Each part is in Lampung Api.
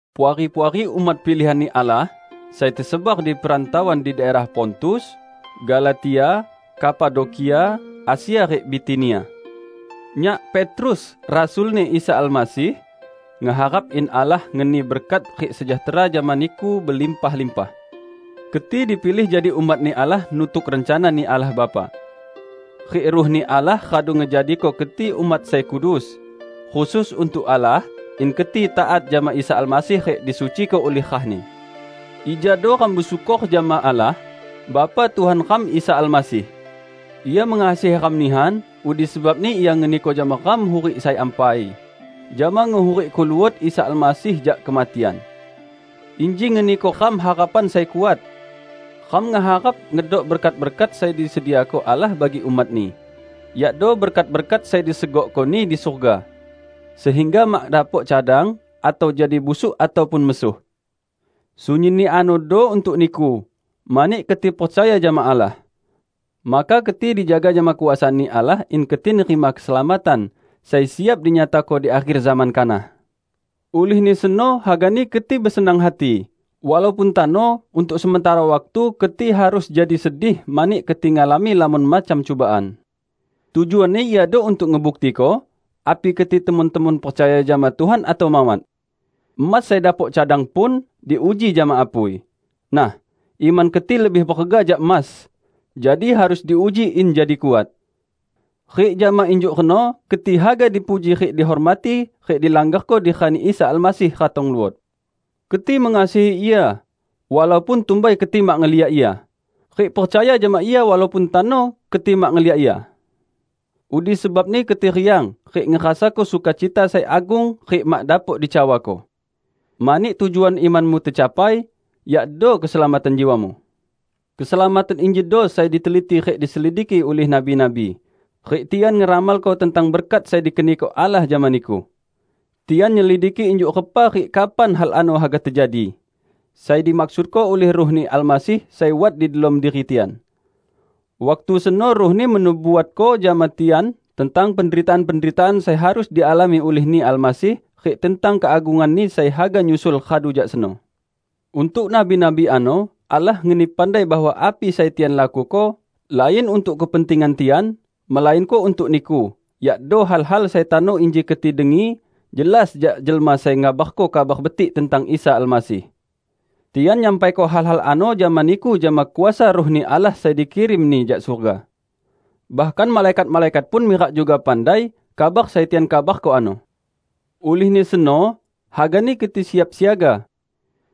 Puari-puari umat pilihan-Ni Allah, sai tesebar di perantauan di daerah Pontus, Galatia, Kapadokia, Asia rik Bitinia! Nyak, Petrus rasul-Ni Isa Almasih, ngeharap in Allah ngeni berkat rik sejahtera jama niku belimpah-limpah. Keti dipilih jadi umat-Ni Allah nutuk rencana-Ni Allah Bapa. Rik Ruh-Ni Allah radu ngejadiko keti umat sai kudus, khusus untuk Allah, in keti taat jama Isa Almasih rik disuciko ulih rah-Ni. Ijado ram besyukor jama Allah, Bapa Tuhan ram Isa Almasih! Ia mengasihi ram nihan, udi sebabni Ia ngeniko jama ram hurik sai ampai, jama ngehurikko luot Isa Almasih jak kematian. Inji ngeniko ram harapan sai kuat. Ram ngeharap ngedok berkat-berkat sai disediako Allah bagi umat-Ni, yakdo berkat-berkat sai disegokko-Ni di surga, sehingga mak dapok cadang, atau jadi busuk ataupun mesuh. Sunyinni anodo untuk niku, mani keti percaya jama Allah. Maka keti dijaga jama kuasa-Ni Allah in keti nerima keselamatan sai siap dinyatako di akher zaman kanah. Ulihni seno hagani keti besenang hati, walaupun tano untuk sementara waktu keti harus jadi sedih mani keti ngalami lamon macam cubaan. Tujuanni iado untuk ngebuktiko api keti temon-temon percaya jama Tuhan atau mawat. Emas sai dapok cadang pun, diuji jama apui. Nah, iman keti lebih berega jak emas, jadi harus diuji in jadi kuat. Rik jama injuk reno keti haga dipuji rik dihormati rik dilanggarko di rani Isa Almasih ratong luot. Keti mengasihi Ia, walaupun tumbai keti mak ngeliak Ia. Rik percaya jama Ia walaupun tano keti mak ngeliak Ia. Udi sebabni keti riang, rik ngerasako sukacita sai agung rik mak dapok dicawako. Mani tujuan imanmu tecapai, yakdo keselamatan jiwamu. Keselamatan injido sai diteliti rik diselidiki ulih nabi-nabi, rik tian ngeramalko tentang berkat sai dikeniko Allah jama niku. Tian nyelidiki injuk repa rik kapan hal ano haga tejadi; sai dimaksudko ulih Ruh-Ni Almasih sai wat di delom diri tian. Waktu seno Ruh-Ni menubuatko jama tian tentang penderitaan-penderitaan sai harus dialami ulih-Ni Almasih rik tentang keagungan-Ni sai haga nyusul radu jak seno. Untuk nabi-nabi ano Allah ngeni pandai bahwa api sai tian lakuko lain untuk kepentingan tian, melainko untuk niku; yakdo hal-hal sai tano inji keti dengi jelas jak jelma sai ngabarko Kabar Betik tentang Isa Almasih. Tian nyampaiko hal-hal ano jama niku jama kuasa Ruh-Ni Allah sai dikirim-Ni jak surga. Bahkan malaikat-malaikat pun mirak juga pandai kabar sai tian kabarko ano. Ulihni seno, hagani keti siap siaga.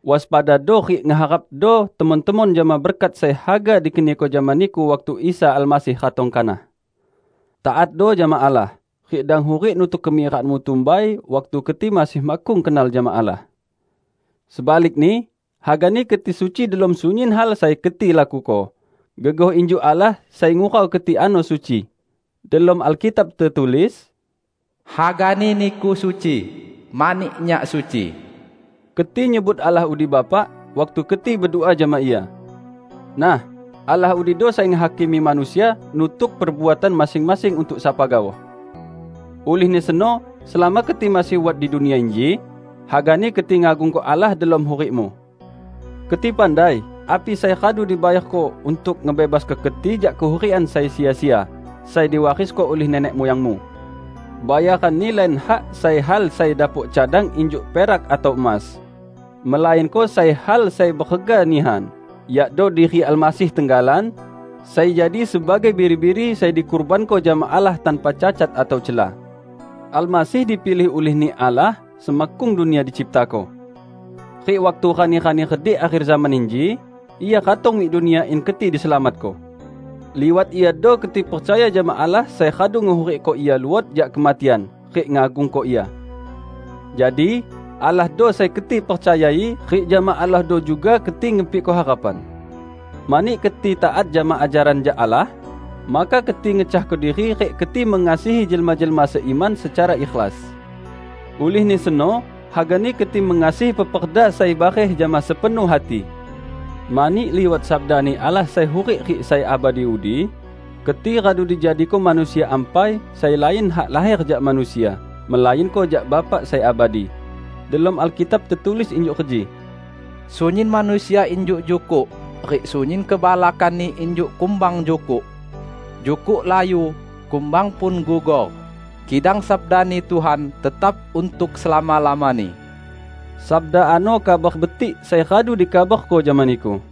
Waspadado rik ngeharapdo temon-temon jama berkat sai haga dikeniko jama niku waktu Isa Almasih ratong kanah. Taatdo jama Allah, rik dang hurik nutuk kemirakanmu tumbai, waktu keti masih makkung kenal jama Allah. Sebalikni, hagani keti suci delom sunyin hal sai keti lakuko, gegoh injuk Allah sai ngurau keti ano suci. Delom Alkitab tetulis, "Hagani niku suci, mani Nyak suci." Keti nyebut Allah udi Bapa waktu keti bedua jama Ia. Nah, Allah udido sai ngehakimi manusia nutuk perbuatan masing-masing untuk sapa gaoh. Ulihni seno selama keti masih wat di dunia inji, hagani keti ngagungko Allah delom hurikmu. Keti pandai api sai radu dibayarko untuk ngebebasko keti jak kehurikan sai sia-sia sai diwarisko ulih nenek muyangmu. Bayaranni lain hak sai hal sai dapok cadang injuk perak atau emas, melainko sai hal sai berega nihan; yakdo diri Almasih tenggalan, sai jadi sebagai biri-biri sai dikurbanko jama Allah tanpa cacat atau cela. Almasih dipilih ulih-Ni Allah semakkung dunia diciptako. Rik waktu rani-rani redik akher zaman inji, Ia ratong mik dunia in keti diselamatko. Liwat Iado keti percaya jama Allah sai radu ngehurikko Ia luot jak kematian rik ngagungko Ia. Jadi, Allahdo sai keti percayai rik jama Allahdo juga keti ngepikko harapan. Mani keti taat jama ajaran jak Allah, maka keti ngecahko diri rik keti mengasihi jelma-jelma seiman secara ikhlas. Ulihni seno, hagani keti mengasihi peperda sai bareh jama sepenuh hati. Mani liwat sabda-Ni Allah sai hurik rik sai abadi udi, keti radu dijadiko manusia ampai sai lain hak laher jak manusia, melainko jak Bapa sai abadi. Delom Alkitab tetulis injuk reji, "Sunyin manusia injuk jukuk, rik sunyin kebalakanni injuk kumbang jukuk. Jukuk layu, kumbang pun gugor; kidang sabda-Ni Tuhan tetap untuk selama-lamani." Sabda ano Kabar Betik sai radu dikabarko jama niku.